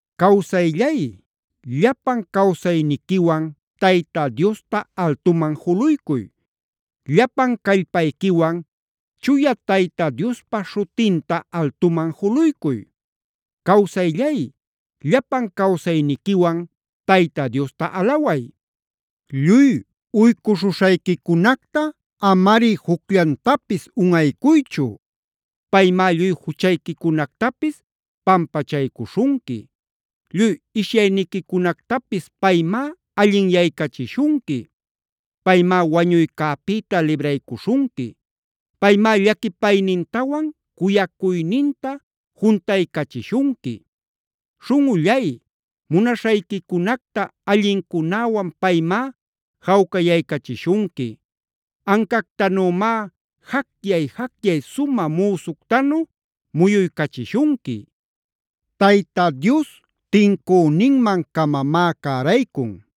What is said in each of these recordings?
Cawsayllay, llapan cawsayniquiwan Tayta Diosta altuman juluycuy. Llapan callpayquiwan chuya Tayta Diospa śhutinta altuman juluycuy. Cawsayllay, llapan cawsayniquiwan Tayta Diosta alaway. Lluy uycuśhuśhayquicunacta amari jucllantapis unꞌaycuychu. Paymá lluy juchayquicunactapis pampachaycuśhunqui. Lluy ishyayniquicunactapis paymá allinyaycachishunqui. Paymá wañuycäpïta libraycuśhunqui. Paymá llaquipaynintawan cuyacuyninta juntaycachishunqui. Śhunꞌullay, munaśhayquicunacta allincunäwan paymá jawcayaycachishunqui. Ancactanümá jacyay-jacyay sumä müsuctanu muyuycachishunqui. Tayta Dios tincüninman-camamá cäraycun.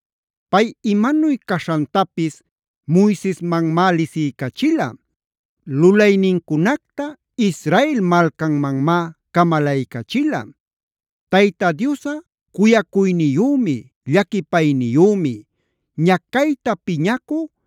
Pay imanuy caśhantapis Moisesmanmá lisiycachila. Lulaynincunacta Israel malcanmanmá camalaycachila. Tayta Diosꞌa cuyacuyniyümi, llaquipayniyümi. Ñacayta piñacü,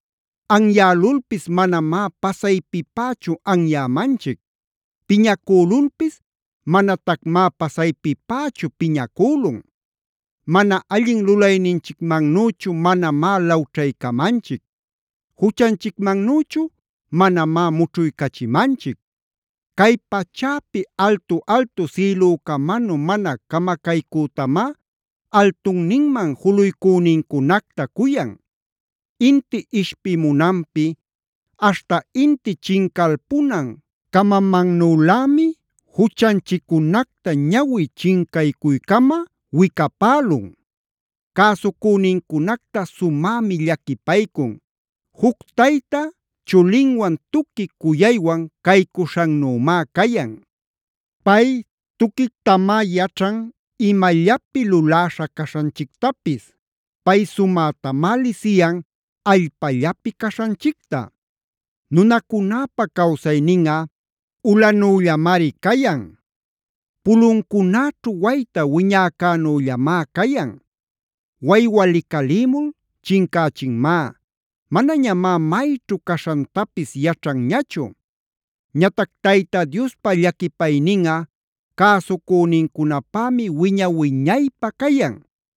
Anyälulpis manamá pasaypipächu anyämanchic. Piñacülulpis manatacmá pasaypipächu piñacülun. Mana allin lulayninchicmannüchu manamá lawćhaycamanchic. Juchanchicmannüchu manamá mućhuycachimanchic. Cay pachäpi altu-altu sïlücamanu mana camacaycütamá altunninman juluycünincunacta cuyan. Inti ishpimunanpi aśhta inti chincalpunan camamannülämi juchanchiccunacta ñawi chincaycuycama wicapälun. Cäsucünincunacta sumämi llaquipaycun. Juc tayta chulinwan tuqui cuyaywan caycuśhannümá cayan. Pay tuquictamá yaćhan imallapi luläśha caśhanchictapis. Pay sumätamá lisiyan allpallapi caśhanchicta. Nunacunäpa cawsayninꞌa ulanüllamari cayan. Puluncunäćhu wayta wiñäcänüllamá cayan. Waywa licalïmul chincächinmá. Manañamá mayćhu caśhantapis yaćhanñachu. Ñatac Tayta Diospa llaquipayninꞌa cäsucünincunäpämi wiña-wiñaypä cayan.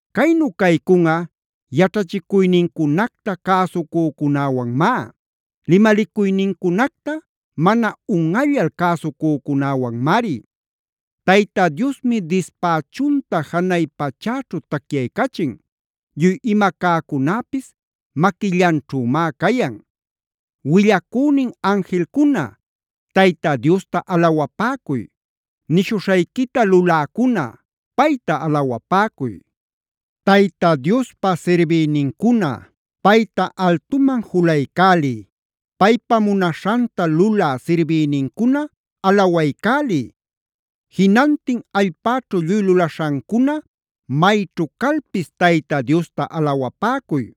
Caynu caycunꞌa yaćhachicuynincunacta cäsucücunäwanmá. Limalicuynincunacta mana unꞌallal cäsucücunäwanmari. Tayta Diosmi dispächunta janay pachäćhu tacyaycachin. Lluy ima cäcunäpis maquillanćhümá cayan. Willacünin anjilcuna, Tayta Diosta alawapäcuy. Nishuśhayquita luläcuna, payta alawapäcuy. Tayta Diospa sirbïnincuna, payta altuman julaycäliy. Paypa munaśhanta lulä sirbïnincuna, alawaycäliy. Jinantin allpäćhu lluy lulaśhancuna, mayćhu calpis Tayta Diosta alawapäcuy.d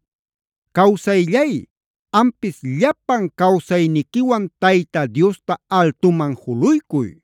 ¡Cawsayllay, ampis llapan cawsayniquiwan Tayta Diosta altuman juluycuy!